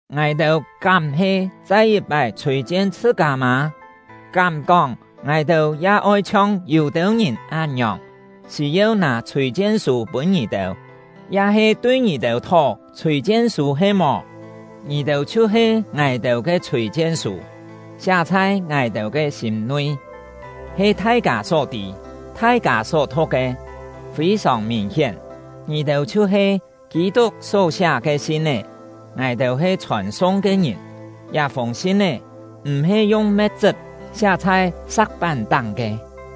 Ngài-têu kám he chai yit-pái chhûi-chien chhṳ-kâ mâ? Kám kóng ngài-têu ya oi chhiong yû-têu ngìn án-ngiòng, sî-yeu nâ chhûi-chien-sû pûn ngì-têu, ya-he tui ngì-têu thó chhûi-chien-sû he-mò? Ngì-têu chhiu-he ngài-têu ke chhûi-chien-sû, siá chhai ngài-têu ke sîm-nui, he thai-kâ só tî, thai-kâ só thu̍k ke. Fî-sòng mìn-hién, ngì-têu chhiu-he Kî-tuk só siá ke sin-é, ngài-têu he chhòn-sung ke ngìn. Liá-fûng sin-é m̀-he yung me̍t-chṳp siá chhai sa̍k-pán-táng ke,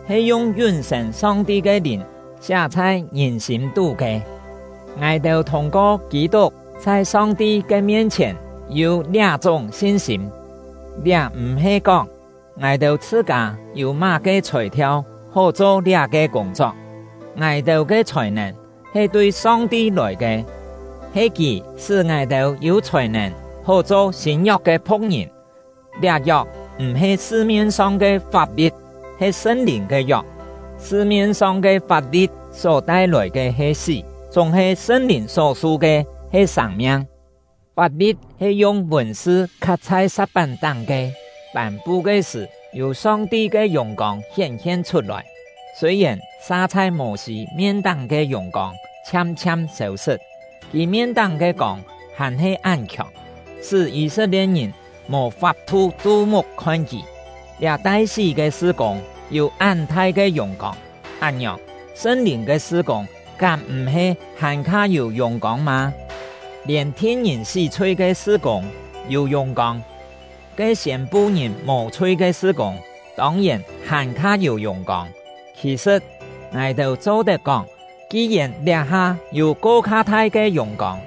he yung yún-sên Song-ti ke Lìn siá chhai ngìn sîm-tú ke. Ngài-têu thûng-ko Kî-tuk chhai Song-ti ke mien-chhièn yû liá-chúng sin-sîm. Liá m̀-he kóng, ngài-têu chhṳ-kâ yû má-ke chhòi-thiau hó cho liá-ke kûng-chok; ngài-têu ke chhòi-nèn he tui Song-ti lòi ke. He Kì sṳ́ ngài-têu yû chhòi-nèn hó cho sîn-yok ke phu̍k-ngìn; liá yok m̀-he sṳ-mien-song ke fap-li̍t, he Sṳn-Lìn ke yok. Sṳ-mien-song ke fap-li̍t só tai-lòi ke he sí, chúng-he Sṳn-Lìn só su ke he sâng-miang. Fap-li̍t he yung vùn-sṳ khat chhai sa̍k-pán-táng ke, pân-pu ke sṳ̀, yû Song-ti ke yùng-kông hién-hien chhut-lòi. Sûi-yèn sa chhai Mô-sî mien-táng ke yùng-kông chhiam-chhiam sêu-sṳt, kì mien-táng ke kông hàn-he án khiòng, sṳ́ Yî-set-lie̍t-ngìn mò fap-thu chu-muk khon kì. Liá tai sí lòi ke sṳ-kûng yû án thai ke yùng-kông, án-ngiòng, Sṳn-Lìn ke sṳ-kûng kám m̀-he hàn-kha yû yùng-kông mâ? Lièn thin ngìn sí-chhui ke sṳ-kûng yû yùng-kông; ke siên-pu ngìn mò-chhui ke sṳ-kûng tông-yèn hàn-kha yû yùng-kông! Khì-sṳ̍t, ngài-têu cho-tet kóng, ki-yèn liá-ha yû ko-kha thai ke yùng-kông,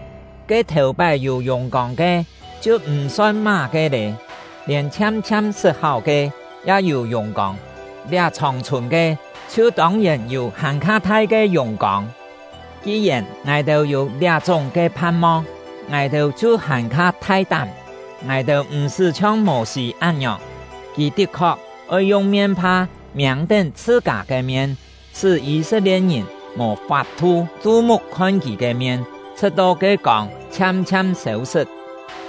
ke thèu-pái yû yùng-kông ke, chhiu m̀-son má-ke lé. Lièn chhiam-chhiam sṳt-háu ke ya yû yùng-kông, liá chhòng-chhùn ke chhiu tông-yèn yû hàn-kha thai ke yùng-kông. Ki-yèn ngài-têu yû liá-chúng ke phan-mong, ngài-têu chhiu hàn-kha thai-tám. Ngài-têu m̀-sṳ́ chhiong Mô-sî án-ngiòng, kì tit-khok oi yung mien-pha miâng-tén chhṳ-kâ ke mien, sṳ́ Yî-set-lie̍t-ngìn mò fap-thu chu-muk khon kì ke mien, chhṳ̍t-to ke kông chhiam-chhiam sêu-sṳt.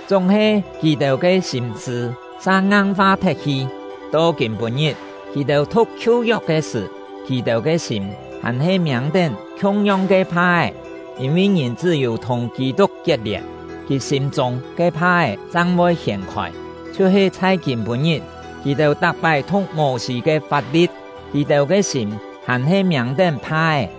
Chúng-he kì-têu ke sîm-sṳ̂ sa ngang-fa thet-hi; to kîm-pû-ngit, kì-têu thu̍k Khiu-yok ke sṳ̀, kì-têu ke sîm hàn-he miâng-tén khiung-yong ke pha-é. Yîn-vi ngìn chṳ́-yû thùng Kî-tuk kiet-lièn, kì sîm-chûng ke pha-é chang voi hiên-khôi. Chhiu-he chhai kîm-pû-ngit, kì-têu tak-pái thu̍k Mô-sî ke fap-li̍t, kì-têu ke sîm hàn-he miâng-tén pha-é.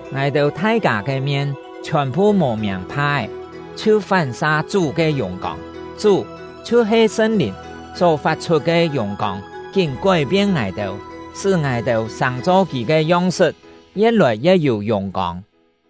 Ngài-têu thai-kâ ke mien chhiòn-phu mò miâng pha-é, chhiu fán-sa “fán-sa” ya-he yi̍t-cho “khon-tó”. Chú ke yùng-kông; Chú — chhiu-he Sṳn-Lìn — só fat-chhut ke yùng-kông kín kói-pien ngài-têu, sṳ́ ngài-têu sàng-cho Kì ke yong-sṳt, ye̍t-lòi ye̍t yû yùng-kông.